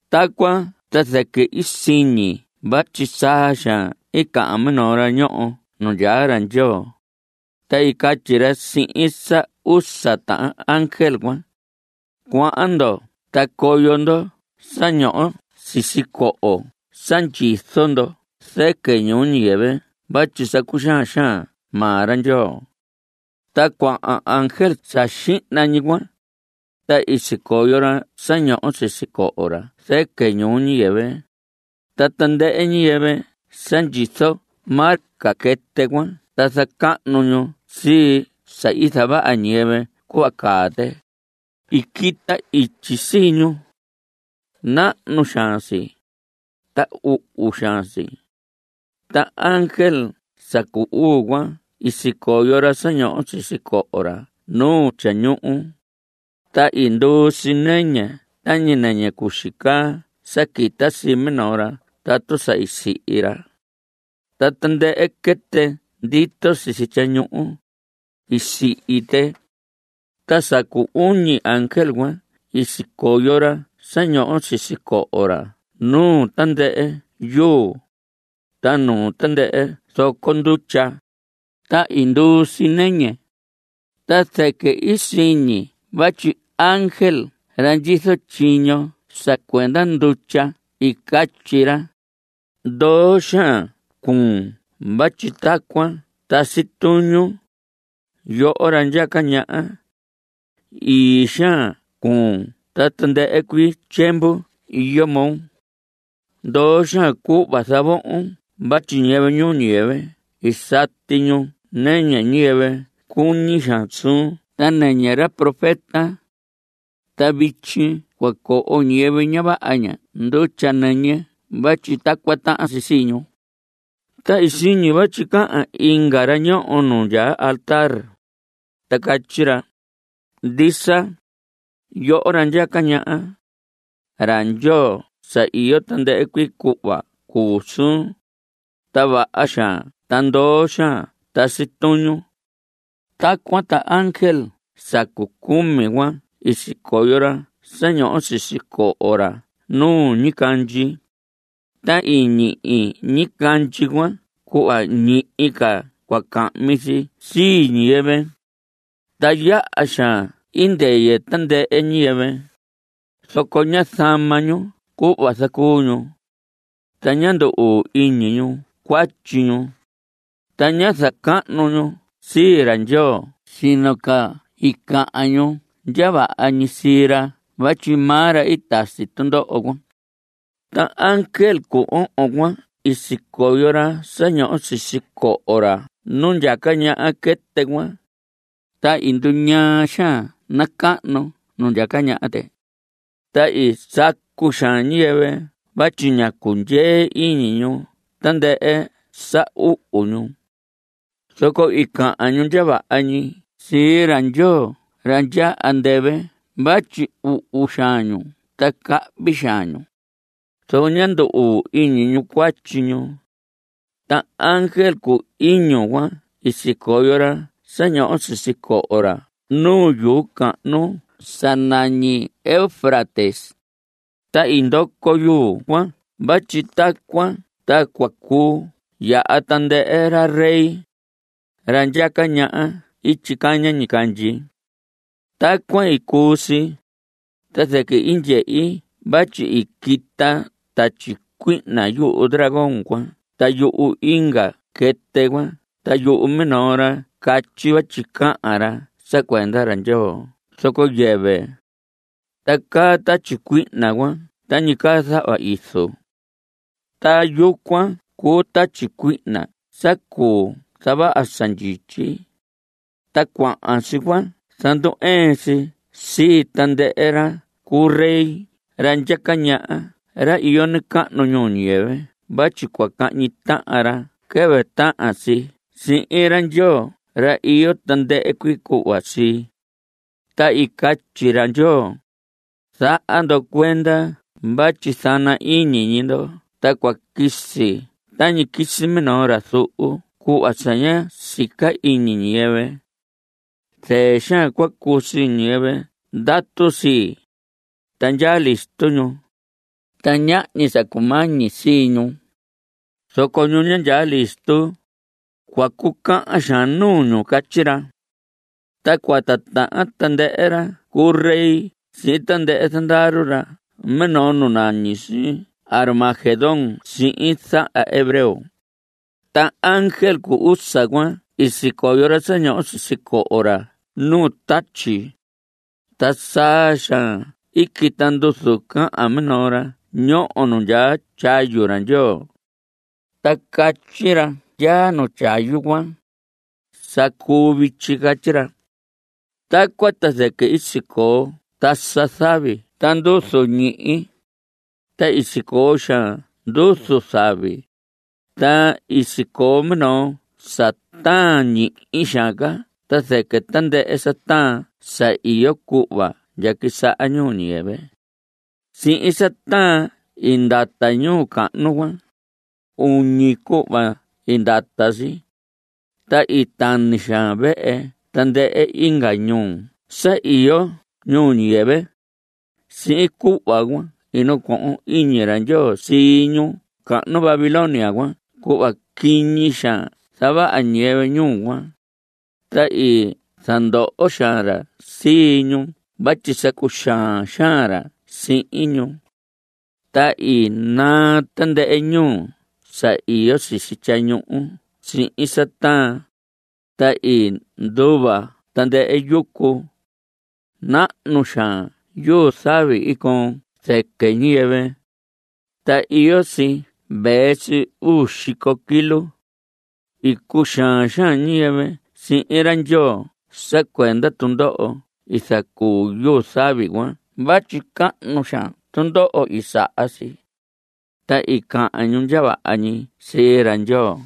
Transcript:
Tacuan ta zɨquɨ i siñi vatyi saa xaan i cahan minoo ra ñoho nu ndyaa ra Ndyoo, ta i catyi ra sihin sa usa tahan ángel cuan: Cuahan ndo ta coyo ndo sa ñoho sisi coho sa ndyizo ndo zɨquɨ ñuu ñiyɨvɨ vatyi sa cuxaan xaan maa ra Ndyoo. Ta cuahan ángel sa xihna ñi cuan, ta i sicoyo ra sa ñoho sisi coho ra zɨquɨ ñuu ñiyɨvɨ, ta tandɨhɨ ñiyɨvɨ sa ndyizo marca quɨtɨ cuan ta zacahnu ñu sii sa i zavaha ñiyɨvɨ cuhva caa tɨ, i quita ityi sii ñu. Nahnu xaan si, ta uhu xaan si. Ta ángel sa cu uu cuan i sicoyo ra sa ñoho sisi coho ra nu tyañuhu, ta i nduu si nɨñɨ tañi nɨñɨ cuxi caa sa quita sii minoo ra tatu sa i sihi ra. Ta tandɨhɨ quɨtɨ ndito sisi tyañuhu, i sihi tɨ. Ta sa cu uñi ángel cuan i sicoyo ra sa ñoho sisi coho ra nu tandɨhɨ yuu, ta nu tandɨhɨ zoco ndutya, ta i nduu si nɨñɨ. Ta zɨquɨ i siñi vatyi ángel ra ndyizo tyiño sa cuenda ndutya i catyi ra: Ndoo xaan cuun vatyi tacuan tasi tuñun, yoho ra ndyaca ñaha. Ii xaan cuun ta tandɨhɨ cuii tyiemvu iyo moo. Ndoo xaan cuhva zavohon vatyi ñiyɨvɨ ñuu ñiyɨvɨ i sati ñu nɨñɨ ñiyɨvɨ cuñi xaan suun ta nɨñɨ ra profeta. Ta vityi cua coho ñiyɨvɨ ña vaha ña ndutya nɨñɨ vatyi tacuan tahan si sii ñu. Ta i siñi vatyi cahan inga ra ñoho nu ndyaa altar, ta catyi ra: Ndisa, yoho ra ndyaca ñaha. Ra Ndyoo sa iyo tandɨhɨ cuii cuhva cuu suun, ta vaha xaan ta ndoo xaan tasi tuñun. Tacuan ta ángel sa cu cumi cuan i sicoyo ra sa ñoho sisi coho ra nu ñicandyi, ta i ñihi ñicandyi cuan cuhva ñihi ca cua cahmi si sii ñiyɨvɨ. Ta yaha xaan i ndɨyɨ tandɨhɨ ñiyɨvɨ, zoco ñá zama ñu cuhva zacuu ñu. Ta ñá ndu‑uu iñi ñu cuatyi ñu, ta ñá zacahnu ñu sii ra Ndyoo sino ca i cahan ñu ndya vaha ñi sii ra vatyi maa ra i tasi tundoho cuan. Ta ángel cu ohon cuan i sicoyo ra sa ñoho sisi coho ra nu ndyaca ñaha quɨtɨ cuan, ta i nduñaa xaan nacahnu nu ndyaca ñaha tɨ. Ta i sacu xaan ñiyɨvɨ vatyi ña cundyee iñi ñu tandɨhɨ sa uhu ñu. Zoco i cahan ñu ndya vaha ñi sii ra Ndyoo ra ndyaa andɨvɨ vatyi uhu xaan ñu ta cahvi xaan ñu, zoco ñá ndu‑uu iñi ñu cuatyi ñu. Ta ángel cu iñu cuan i sicoyo ra sa ñoho sisi coho ra nu yuu cahnu sa nañi Eufrates, ta i ndoco yuu cuan vatyi tacuan ta cua cuu yaha tandɨhɨ ra rey, ra ndyaca ñaha ityi caña ñicandyi. Tacuan i cuu si, ta zɨquɨ i ndyehi vatyi i quita tatyi cuihna yuhu dragón cuan ta yuhu inga quɨtɨ cuan ta yuhu minoo ra i catyi vatyi cahan ra sa cuenda ra Ndyoo zoco yɨvɨ. Ta caa tatyi cuihna cuan tañi caa zahva izu. Ta yucuan cuu tatyi cuihna sa cuu zavaha sa ndyityi, ta cuahan si cua zandu‑ɨɨn si sii tandɨhɨ ra cu rey ra ndyaca ñaha ra iyo nacahnu ñuu ñiyɨvɨ vatyi cua cahñi tahan ra quɨvɨ tahan si sihin ra Ndyoo ra iyo tandɨhɨ cuii cuhva sii. Ta i catyi ra Ndyoo: Zaha ndo cuenda vatyi zana ñi iñi ndo ta cua quisi tañi quisi minoo ra zuhu cuhva sa ña sica iñi ñiyɨvɨ. Zɨɨ xaan cua cuu sii ñiyɨvɨ ndatu sii, ta ndyaa listo ñu, ta ñahñi sa cumañi sii ñu. Zoco ñu ña ndyaa listo, cua cucahan xaan nuu ñu. Catyi ra. Ta cua titahan tandɨhɨ ra cu rey sihin tandɨhɨ zandaru ra minoo nu nañi si Armagedón sihin zahan hebreo. Ta ángel cu usa cuan i sicoyo ra sa ñoho sisi coho ra nu tatyi. Ta saa xaan i quita nduzu cahan minoo ra ñoho nu ndyaa tyayu ra Ndyoo. Ta catyi ra ndyaa nu tyayu cuan: Sa cuu vityi. Catyi ra. Tacuan ta zɨquɨ i sicoo tasa zavi ta nduzu ñihi, ta i sicoo xaan nduzu zavi, ta i sicoo minoo sa taan ñihi xaan ca ta zɨquɨ tandɨhɨ sa taan sa iyo cuhva ndya quisaha ñuu ñiyɨvɨ. Sihin sa taan i ndata ñuu cahnu cuan. Uñi cuhva i ndata si. Ta i tani xaan vehe tandɨhɨ inga ñuu sa iyo ñuu ñiyɨvɨ. Sihin cuhva cuan i nacohon iñi ra Ndyoo sii ñuu cahnu Babilonia cuan cuhva quiñi xaan zavaha ñiyɨvɨ ñuu cuan, ta i zandoho xaan ra sii ñu vatyi sa cuxaan xaan ra sihin ñu. Ta i naa tandɨhɨ ñuhu sa iyo sisi tyañuhu sihin sa taan, ta i nduva tandɨhɨ yucu. Nahnu xaan yuu zavi i coon zɨquɨ ñiyɨvɨ. Ta iyo si vee si uu xico kilo. I cuxaan xaan ñiyɨvɨ sihin ra Ndyoo sa cuenda tundoho i zacuu yuu zavi cuan vatyi cahnu xaan tundoho i saha si, ta i cahan ñu ndya vaha ñi sii ra Ndyoo.